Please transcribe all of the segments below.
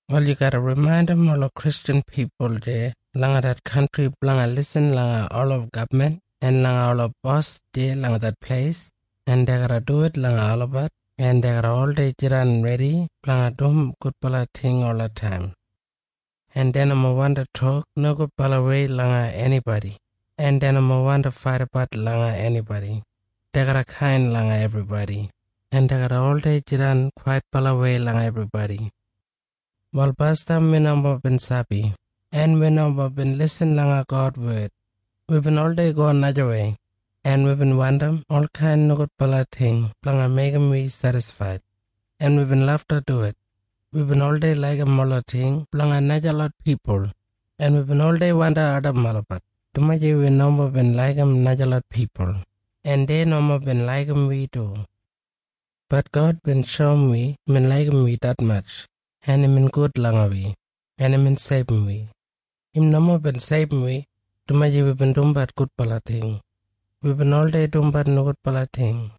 Wal yu garra rimaindim ola Kristjan pipul deya langa det kantri blanga lisin langa ola gabman en langa ola bos deya langa det pleis, en dei garra duwit langa olabat, en dei garra oldei jidan redi blanga dum gudbala ting olataim. En dei nomo wandi tok nogudbalawei langa enibodi, en dei nomo wandi faidabat langa enibodi. Dei garra kain langa ebribodi, en dei garra oldei jidan kwaitbalawei langa ebribodi. Wal basdam wi nomo bin sabi, en wi nomo bin lisin langa God wed. Wibin oldei go najawei, en wibin wandim olkain nogudbala ting blanga meigim wi sedisfaid. En wibin lafta duwit. Wibin oldei laigim ola ting blanga najalot pipul, en wibin oldei wandi ardim olabat, dumaji wi nomo bin laigim najalot pipul, en dei nomo bin laigim wi du. Bat God bin shoum wi imbin laigim wi detmatj, en imbin gud langa wi, en imbin seibum wi. Im nomo bin seibum wi, dumaji wibin dumbat gudbala ting. Wibin oldei dumbat nogudbala ting.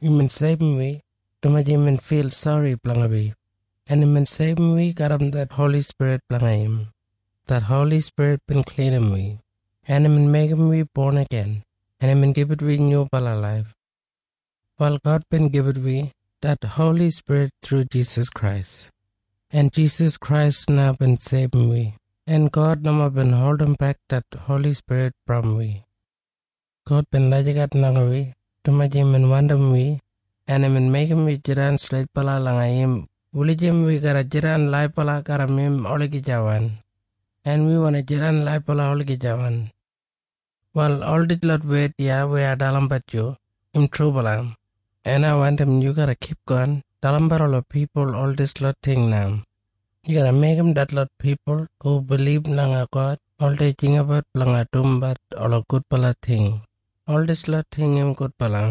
Imbin seibum wi, dumaji imbin fil sori blanga wi, en imbin seibum wi garram det Holi Spirit blanga im. Det Holi Spirit bin klinim wi, en imbin meigim wi bon igin, en imbin gibit wi nyubala laif. Wal God bin gibit wi det Holi Spirit thru Jisas Krais. En Jisas Krais na bin seibum wi, en God nomo bin holdimbek det Holi Spirit brom wi. God bin lagijat langa wi, dumaji imbin wandim wi, en imbin meigim wi jidan streitbala langa im wulijim wi garra jidan laibala garram im olagijawan. En wi wandi jidan laibala olagijawan. Wal ol dislot wed iya weya ai dalimbat yu, im trubala. En ai wandim yu garra kipgon dalimbat ola pipul ol dislot ting na. Yu garra meigim detlot pipul hu bilib langa God oldei jinggabat blanga dumbat ola gudbala ting. Ol dislot ting im gudbala,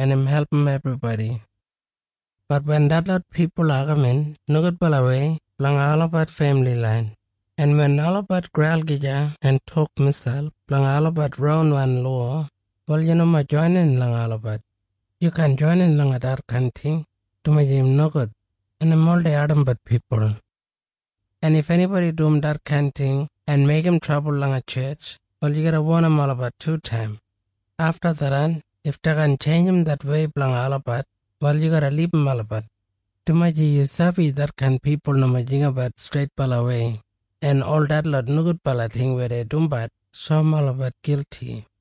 en im album ebribodi. Bat wen detlot pipul agamin nogudbalawei blanga olabat femili lain, en wen olabat graul gija en tok miselp blanga olabat ronwan lowa, wal yu nomo joinin langa olabat. Yu kaan joinin langa detkain ting, dumaji im nogud, en im oldei ardimbat pipul. En if enibodi dum detkain ting en meigim trabul langa tjetj, wal yu garra wonim olabat tutaim. Afta tharran if dei kaan tjeinjim det wei blanga olabat, wal yu garra libum olabat. Dumaji yu sabi detkain pipul nomo jinggabat streitbalawei, en ol detlot nogudbala ting weya dei dumbat shoum olabat gilti.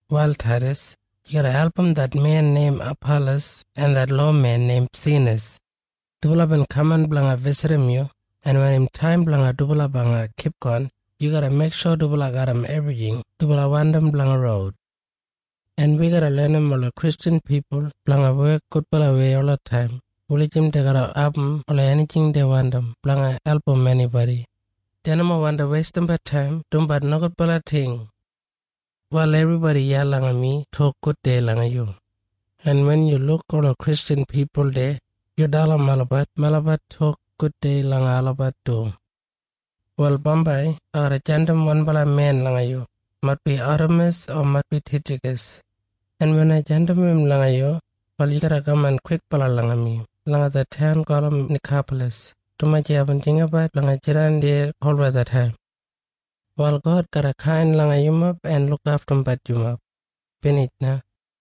Wal Taidas, yu garra album det men neim Apalas en det lowamen neim Senas. Dubala bin kaman blanga bisitim yu, en wen im taim blanga dubala blanga kipgon, yu garra meiksho dubala garram ebrijing dubala wandim blanga roud. En wi garra lenim ola Kristjan pipul blanga wek gudbalawei olataim wulijim dei garra abum ola enijing dei wandim blanga album enibodi. Dei nomo wandi weistimbat taim dumbat nogudbala ting. Wal ebribodi iya langa mi tok gudei langa yu. En wen yu luk ola Kristjan pipul deya, yu dalim olabat melabat tok gudei langa olabat du. Wal bambai ai garra jandim wanbala men langa yu, maitbi Atemas o maitbi Titjakas. En wen ai jandim im langa yu, wal yu garra kaman kwikbala langa mi langa det taun gulum Nikapalas, dumaji aibin jinggabat blanga jidan deya kolwethataim. Wal God garra kain langa yumob en lukaftumbat yumob. Binij na.